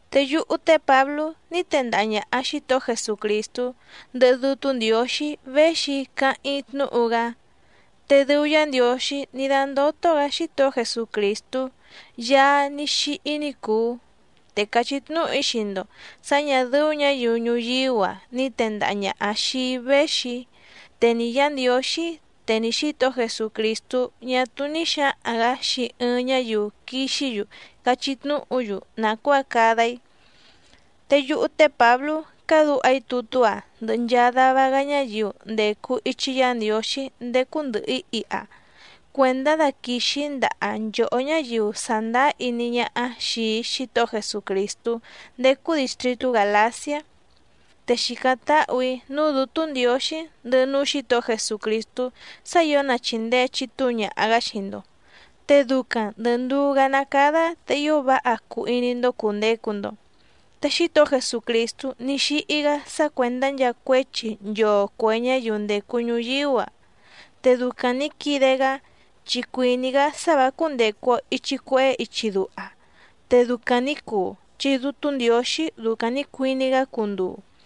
Te yúhú té Pǎblú ní tendaha ñàha Xítohó Jesucrìstú, ndɨhɨ Dútú Ndiǒxí véxi‑í càháⁿ‑í tnúhu‑gá. Te dɨu Yá Ndiǒxí ní dándótó‑gǎ Xítohó Jesucrìstú Yaá ní xíhí ní cùu. Te càchí tnúhu‑í xii‑ndo sǎ ñà dɨ́ú ñǎyiu ñuyíú‑a ni tèndaha ñaha xii‑í véxi‑í, te ni Yǎ Ndiǒxí te ni Xǐtohó Jesucrìstú ñá túú ní xǎhaⁿ‑gǎ xii ɨɨⁿ ñáyiu quixí‑yu cachí tnúhu‑yu nàcuáa cada‑í. Te yúhú té Pǎblú cádǔha‑í tutú‑a ndɨhɨ nchaa dava‑gá ñáyiu ndècu ichi Yá Ndiǒxí ndécú ndɨ̀hɨ‑í iha cuèndá daquìxi‑í ndaha nchòhó ñáyiu sàndáá iní ñáhá xìi Xítohó Jesucrìstú ndécú dìstritú Gàlaciá. Te xìcáⁿ táhù‑í núú Dǔtú Ndiǒxí, ndɨhɨ núú Xǐtohó Jesucrìstú sá ǐo na chìndee chitúu ñaha‑gá xii‑ndo, te ducaⁿ ndɨ̀ nduú‑gá ná cádá te ío váha cuu iní‑ndó cùndecu‑ndo. Te Xítohó Jesucrìstú ní xíhí‑gá sá cuèndá nchaa cuéchi nchoo cuè ñáyiu ndècu ñuyíú‑a. Te ducaⁿ nǐ quide‑gá, chi cuìní‑gá sá vǎ cúndècu‑o ichi cuehé ichi duha. Te ducaⁿ nǐ cuu, chi Dútú Ndiǒxí ducaⁿ nǐ cuiní‑gá cunduu.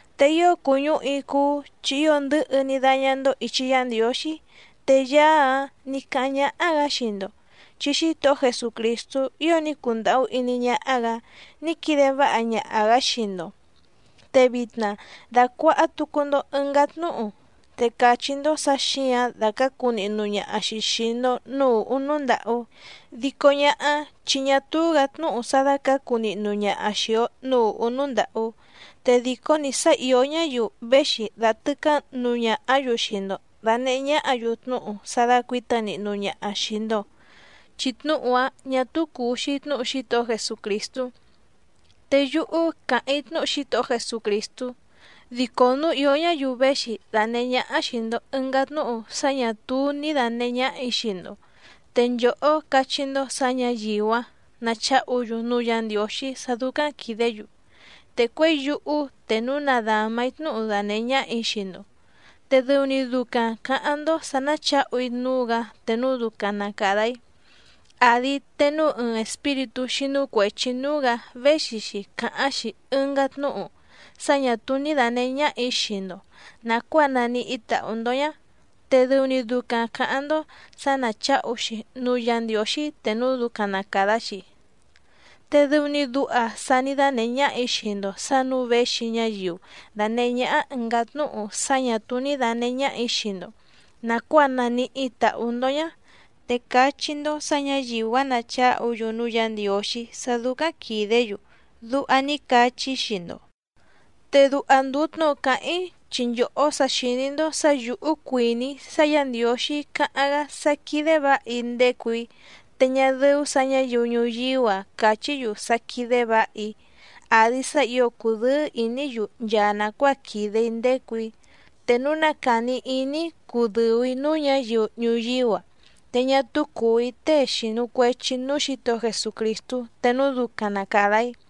Te ío cùñúhu‑í cúú chi ío ndɨ̌hɨ ní dáñá‑ndó ìchi Yá Ndiǒxí. Te Yaá‑áⁿ nǐ cáháⁿ ñáhá‑gǎ xii‑ndo, chi Xítohó Jesucrìstú ío ní cundàhú iní ñáhá‑gǎ ní quide váha ñaha‑gǎ xii‑ndo, te vitna dàcuaha tucu‑ndo ɨngá tnúhu, te càchí‑ndó sǎ xǐǎⁿ dàcácu nihnu ñaha‑xi xìi‑ndo núú ùhú núú ndàhú. Dico ñáhá, chi ñá túú‑gǎ tnúhu sá dácǎcu nihnu ñaha xìi‑o núú ùhú núú ndàhú. Te dìcó‑ni sá ìó ñáyiu véxi dàtɨcá nuu ñahá‑yu xii‑ndo dànehé ñáhǎ‑yu tnúhu sá dácuǐta nihnu ñaha xìi‑ndo, chi tnúhu‑áⁿ ñà túú cùu‑xi tnúhu Xítohó Jesucrìstú. Te yúhú càháⁿ‑í tnúhu Xítohó Jesucrìstú, dico núu ìó ñáyiu véxi dànehé ñáhá xìi‑ndo ɨngá tnúhu sá ñà túú ní dànehé ñáhà‑í xii‑ndo, te nchòhó cachí‑ndó sǎ ñǎyiu‑áⁿ nacháhu‑yu núú Yǎ Ndiǒxí sá dúcáⁿ quìdé‑yu. Te cuěi yúhú, te núu na dàma‑í tnúhu danèhé ñáhà‑í xii‑ndo, te dɨu‑ni ducaⁿ cǎháⁿ‑ndó sǎ náchǎhu‑í núú‑gǎ te núu ducaⁿ na càda‑í. Àdi te núu ɨɨⁿ espíritú xínú cuèchi núú‑gǎ véxi‑xi càháⁿ‑xi ɨngá tnúhu sá ñà túú ní dànehé ñáhà‑í xii‑ndo nàcuáa naníhí tàhú‑ndó ñá, te dɨu‑ni ducaⁿ cǎháⁿ‑ndó sǎ náchǎhu‑xi núú Yǎ Ndiǒxí te núu ducaⁿ na càda‑xi. Te dɨu‑ni duha sa ní dánèhé ñáhà‑í xii‑ndo sǎ nǔu véxi ñáyiu dànehé ñáhá ɨ̀ngá tnúhu sá ñà túú ní dànehé ñáhà‑í xii‑ndo nàcuáa naníhí tàhú‑ndó ñá, te cachí‑ndó sǎ ñǎyiu‑áⁿ nacháhu‑yu núú Yǎ Ndiǒxí sá dúcáⁿ quìdé‑yu, duha ní cachí‑í xii‑ndo. Te duha ndùu tnúhu càháⁿ‑í chi nchòhó sa xìní‑ndó sǎ yǔhú cuìní‑í sá Yǎ Ndiǒxí cáháⁿ‑gá sá quídé vǎha‑í ndécù‑í, te ñá dɨ́ú sǎ ñǎyiu ñuyíú‑a cachí‑yu sá quídé vǎha‑í, àdi sá ǐo cùdɨ́ɨ́ ìní‑yu nchaa nàcuáa quìde‑í ndécù‑í. Te núu na càni iní‑í cudɨ̀u‑í núú ñǎyiu ñuyíú‑a, te ñá túú cùu‑í tée xìnu cuechi núú Xǐtohó Jesucrìstú te núu ducaⁿ na càda‑í.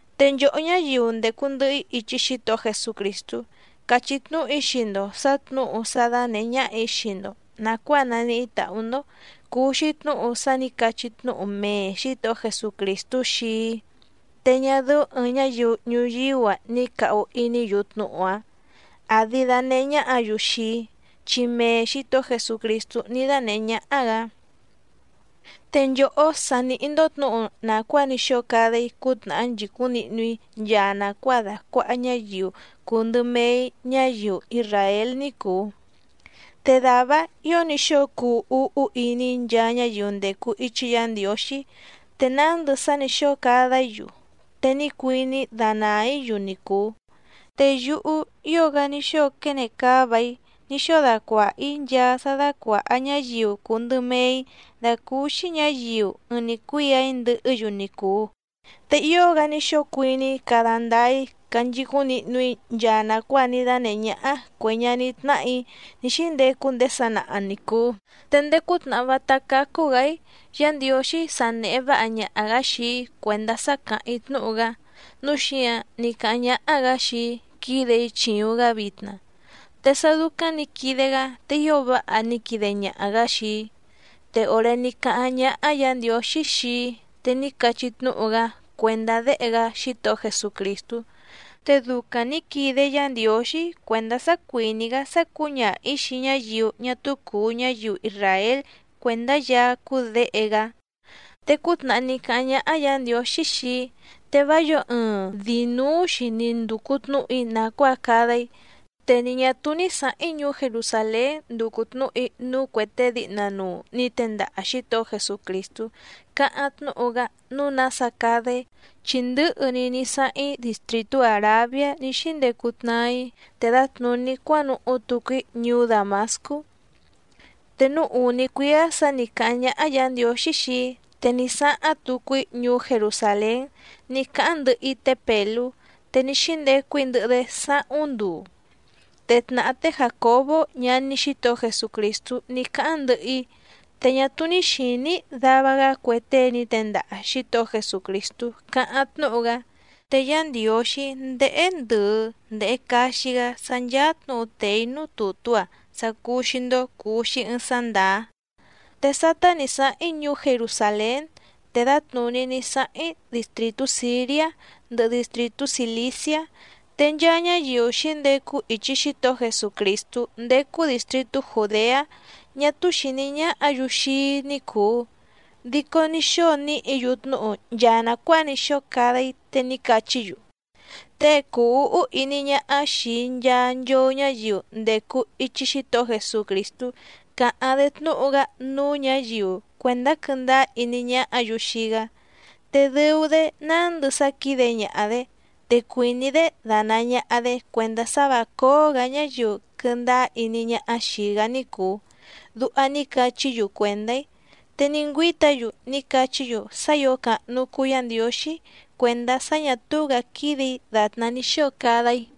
Te nchòhó ñáyiu ndècu ndɨhɨ‑í ichi Xítohó Jesucrìstú càchí tnúhu‑í xii‑ndo sǎ tnǔhu sá dánèhé ñáhà‑í xii‑ndo nàcuáa naníhí tàhú‑ndó cùu‑xi tnúhu sá nǐ cachí tnúhu mee Xǐtohó Jesucrìstú xii‑í, te ñá dɨ́ú ɨ̀ɨⁿ ñáyiu ñuyíú‑a ni càhu iní‑yu tnúhu‑áⁿ, àdi danehé ñáhǎ‑yu xii‑í, chi mee Xǐtohó Jesucrìstú ní dánèhé ñáhá‑gǎ. Te nchòhó sa nìhí‑ndó tnǔhu nàcuáa ní xóo cada‑í cútnàhá nchìcúⁿ nihnu‑í nchaa nàcuáa dàcuaha ñáyiu cùu ndɨ mee‑í ñáyiu isràél ní cùu. Te dàvá‑áⁿ ǐo ní xóo cuu úhú iní‑í nchaa ñáyiu ndècu ichi Yá Ndiǒxí, te nándɨ sá nǐ xóo cada‑í‑yu, te ní cuiní‑í danàa‑í‑yu ni cùu. Te yúhú ío‑gá ní xóo quene cáva‑í ní xóo dacuàha‑í nchaa sá dácuàha ñáyiu cùu ndɨ mee‑í dàcúúxí ñǎyiu ɨɨⁿ‑ni cuíà‑í ndɨhɨ́‑yu ni cùu, te ío‑gá ní xóo cuiní‑í cada ndáá‑í canchicúⁿ nihnu‑í nchaa nàcuáa ní dánèhé ñáhá cuè ñaní tnáhà‑í ní xíndecu ndéé sanaha ni cùu. Te ndéé cútnàhá vátá cácú‑gǎ‑í Yǎ Ndiǒxí sa nèhe váha ñaha‑gǎ xii‑í cuèndá sá càháⁿ‑í tnúhu‑gá, núu xíǎⁿ ní cáháⁿ ñáhá‑gǎ xii‑í quídè‑í chìuⁿ‑gá vitna, te sá dúcáⁿ nǐ quide‑gá te ío váha ní quide ñaha‑gǎ xii‑í. Te òré ní cáháⁿ ñáhá Yǎ Ndiǒxí xii‑í te ní cachí tnúhu‑gá cuèndá Déhe‑gá Xítohó Jesucrìstú. Te ducaⁿ nǐ quide Yá Ndiǒxí cuèndá sá cuìní‑gá sá cǔñaha‑ǐ xii ñáyiu ñá túú cùu ñáyiu isràél cuèndá Yaá cúú Děhe‑gá. Te cútnàhá ní cáháⁿ ñáhá Yǎ Ndiǒxí xii‑í, te vá yǒo ɨɨⁿ dìi núú‑xi ni ndùcu tnúhu‑í nàcuáa cada‑í. Te ni ñà túú ní sǎháⁿ‑í ñuú Jerusàlén nducu tnǔhu‑í núú cuè tée díhna nuu nǐ tendaha Xǐtohó Jesucrìstú càháⁿ tnúhu‑gá nǔu nása cada‑í, chi ndɨ̌hɨ‑ni ní sáháⁿ‑í distrìtú Àrabiá ní xíndecu tnaa‑í te dǎtnùní cuánuhú tucu‑í ñuú Dàmascú. Te núú ùní cuíá sǎ nǐ cáháⁿ ñáhá Yǎ Ndiǒxí xii‑í, te ní sáháⁿ tucu‑í ñuú Jerusàlén ní cáháⁿ ndɨhɨ‑í té Pèlú, te ní xíndecu‑í ndɨhɨ‑dé sáhúⁿ nduu. Te tnàhá té Jàcobó ñaní Xítohó Jesucrìstú ní cáháⁿ ndɨhɨ‑í. Te ñá túú ní xìní‑í dava‑gá cue tée ní tendaha Xǐtohó Jesucrìstú càháⁿ tnúhu‑gá. Te Yá Ndiǒxí ndéhé ndɨ̀ɨ ndehe caxi‑gá sá ncháá tnǔhu tèe‑í núú tùtú‑a sá cúú‑xí‑ndó cùu‑xi ɨɨⁿ sá ndàá. Te sátá nǐ sáháⁿ‑í ñuú Jerusàlén, te dǎtnùní ní sáháⁿ‑í distrìtú Sìriá, ndɨhɨ distrìtú Cìliciá. Te nchaa ñáyiu xǐndecu ichi Xítohó Jesucrìstú ndécú dìstritú Jùdeá ñá túú xìní ñáhǎ‑yu xii‑í ní cùu. Dico ní xóo níhǐ‑yu tnúhu nchaa nàcuáa ní xóo cada‑í, te ní cachí‑yu: “Tée cùu úhú iní ñáhá xìi nchaa nchoo ñáyiu ndècu ichi Xítohó Jesucrìstú càháⁿ‑dé tnúhu‑gá núú ñǎyiu cuèndá quɨ́ndáá iní ñáhǎ‑yu xii‑gá, te dɨu‑dé nándɨ sá quídé ñàha‑dé, te cuìní‑dé danàa ñaha‑dé cuèndá sá vǎ cóó‑gǎ ñáyiu quɨndáá iní ñáhá xìi‑gá ní cùu”, duha ní cachí‑yu cuèndá‑í. Te ní ngüíta‑yu ní cachí‑yu sá ǐo càhnu cuu Yá Ndiǒxí cuèndá sá ñà túú‑gǎ quídè‑í dàtná ní xóo cada‑í.